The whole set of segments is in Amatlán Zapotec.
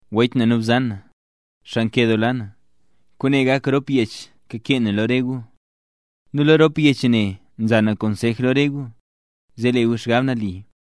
Wech nu bzan, xaa nkedoola na, kwaane gak rop yech kakee na lo re gu. Nu lo rop yech ne nza na konsej lo re gu, zee le gu xgab nali.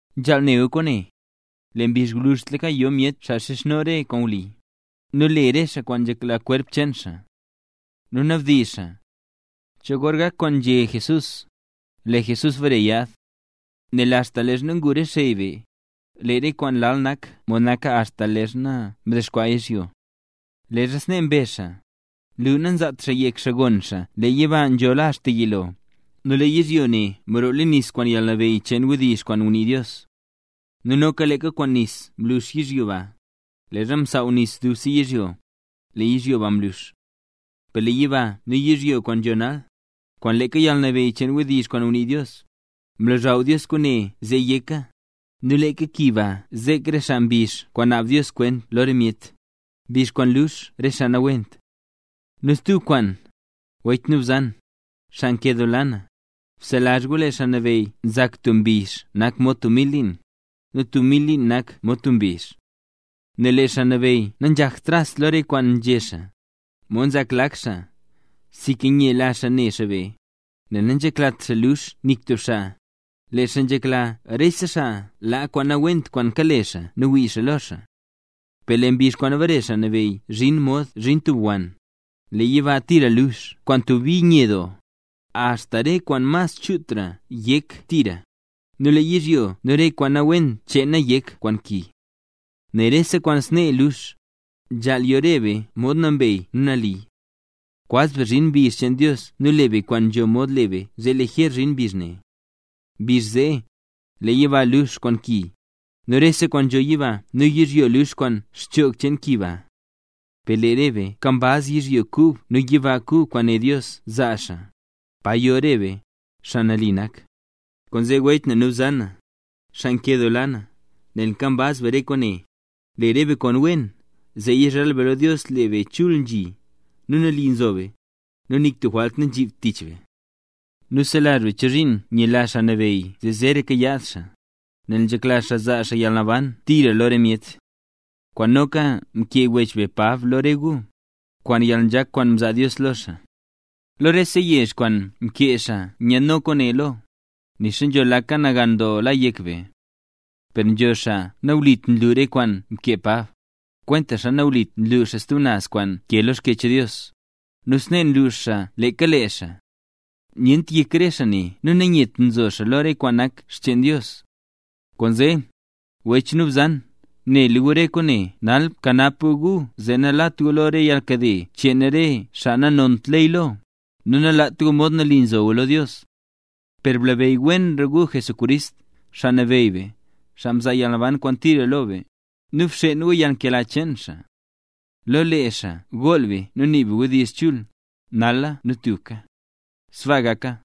Nzhaal ne gu kwaane: Lee mbizh gwluzhtlaka yo myet xaa xizhno re kwaan wli, nu le re xaa kwaan nzhekla kwerp cheen xaa. Nu nabdizh xaa: “¿Cho gor gak kwaan nzhé Jesús, lee Jesús bare yaad? Nel axta leezha ngu re xey be, lee re kwaan lal nak mod naka axta leezha mdexkwaa yizhyo.” Leezha snee mbezh xaa, nlu nazaat xaa yek xaa gon xaa lee yiba nzhola axta yilo, nu lee yizhyo ne mroo leen nis kwaan yalnabeyy cheen wdizh kwaan ngunii Dios. Nu noka leeka kwaan nis mlux yizhyo ba, leezha msaaw nis dubse yizhyo, lee yizhyo ba mlux. Per lee yiba nu yizhyo kwaan nzho nal, kwaan leeka yalnabeyy cheen wdizh kwaan ngunii Dios, mlozhaw Dios kwaane zee yeka, nu leeka ki ba zek re xaa mbizh kwaan naab Dios kwent lo re myet, mbizh kwaan lux re xaa nawent. Nu stub kwaan, wech nu bzan, xaa nkedoola na, bselazh gu lee Xaa Nabeyy nzak tub mbizh nak mod tub mil liin, nu tub mil liin nak mod tub mbizh. Nel lee Xaa Nabeyy nanzhakt tras lo re kwaan nzhé xaa, mod nzak lak xaa, sinka nyela xaa ne xaa be, nel nanzheklat xaa luux nik tub xaa, lee xaa nzhekla rese xaa laa kwaan nawent kwaan kale xaa nu wii xaa lo xaa. Per lee mbizh kwaan bare Xaa Nabeyy zhin mod nzhin tub wann; lee yiba tira lux kwaan tub bi nye doo, axta re kwaan mas chutra yek tira, nu lee yizhyo nu re kwaan nawent cheena yek kwaan ki. Nel rese kwaan snee lux, ¡nzhaal yo re be tub mod nambey nu nali! Kwaz be zhin mbizh cheen Dios nu le be kwaan nzho mod le be zee lijer zhin mbizh ne. Mbizh zee, lee yiba lux kwaan ki, nu rese kwaan nzho yiba nu yizhyo lux kwaan xchoog cheen ki ba. Per lee re be nkambaz yizhyo kub nu yiba kub kwaan né Dios zaa xaa, paro yo re be, xaa nali nak. Kwaanzee, wech nu bzan, xaa nkedoola na, nel nkambaz be re kwaane, le be re kwaan wen, zee yizhal be lo Dios lee be chul nzhi, nu nali zo be, nu nik tub jwalt nanzhibt tich be. Nu selazh be chozhiin nyela Xaa Nabeyy zee zeeraka yaad xaa, nel nzhekla xaa zaa yalnaban tira lo re myet. Kwaane noka mkee wech be Pab lo re gu, kwaan yalnzhak kwaan mzaa Dios lo xaa. Lo rese yech kwaan mkee xaa nyaad kwaane lo, nixa nzho laka nagan doo la yek be. Per nzho xaa nawlit nlu re kwaan mkee Pab, kwentaxa nawlit nlu xaa stub naz kwaan nkee lo Xkyech Dios, nu snee nlux xaa leeka lee xaa. Nyent yek re xaa ne nu nanyet nzo xaa lo re kwaan nak xcheen Dios. Kwaanzee, wech nu bzan, nela gu re kwaane nal, bkanap gu gu zee nalat gu lo re yalnkade cheen re xaa nanont ley lo, nu nalaat gu mod nali nzo gu lo Dios. Per blabeyy wenra gu Jesucrist, Xaa Nabeyy be, xaa mzaa yalnaban kwaan tira lo be, nu bxeen gu yalnkela cheen xaa. ¡Lo lee xaa gool be nu nii be re wdizh chul, nala nu tubka! ¡Sbaa gaka!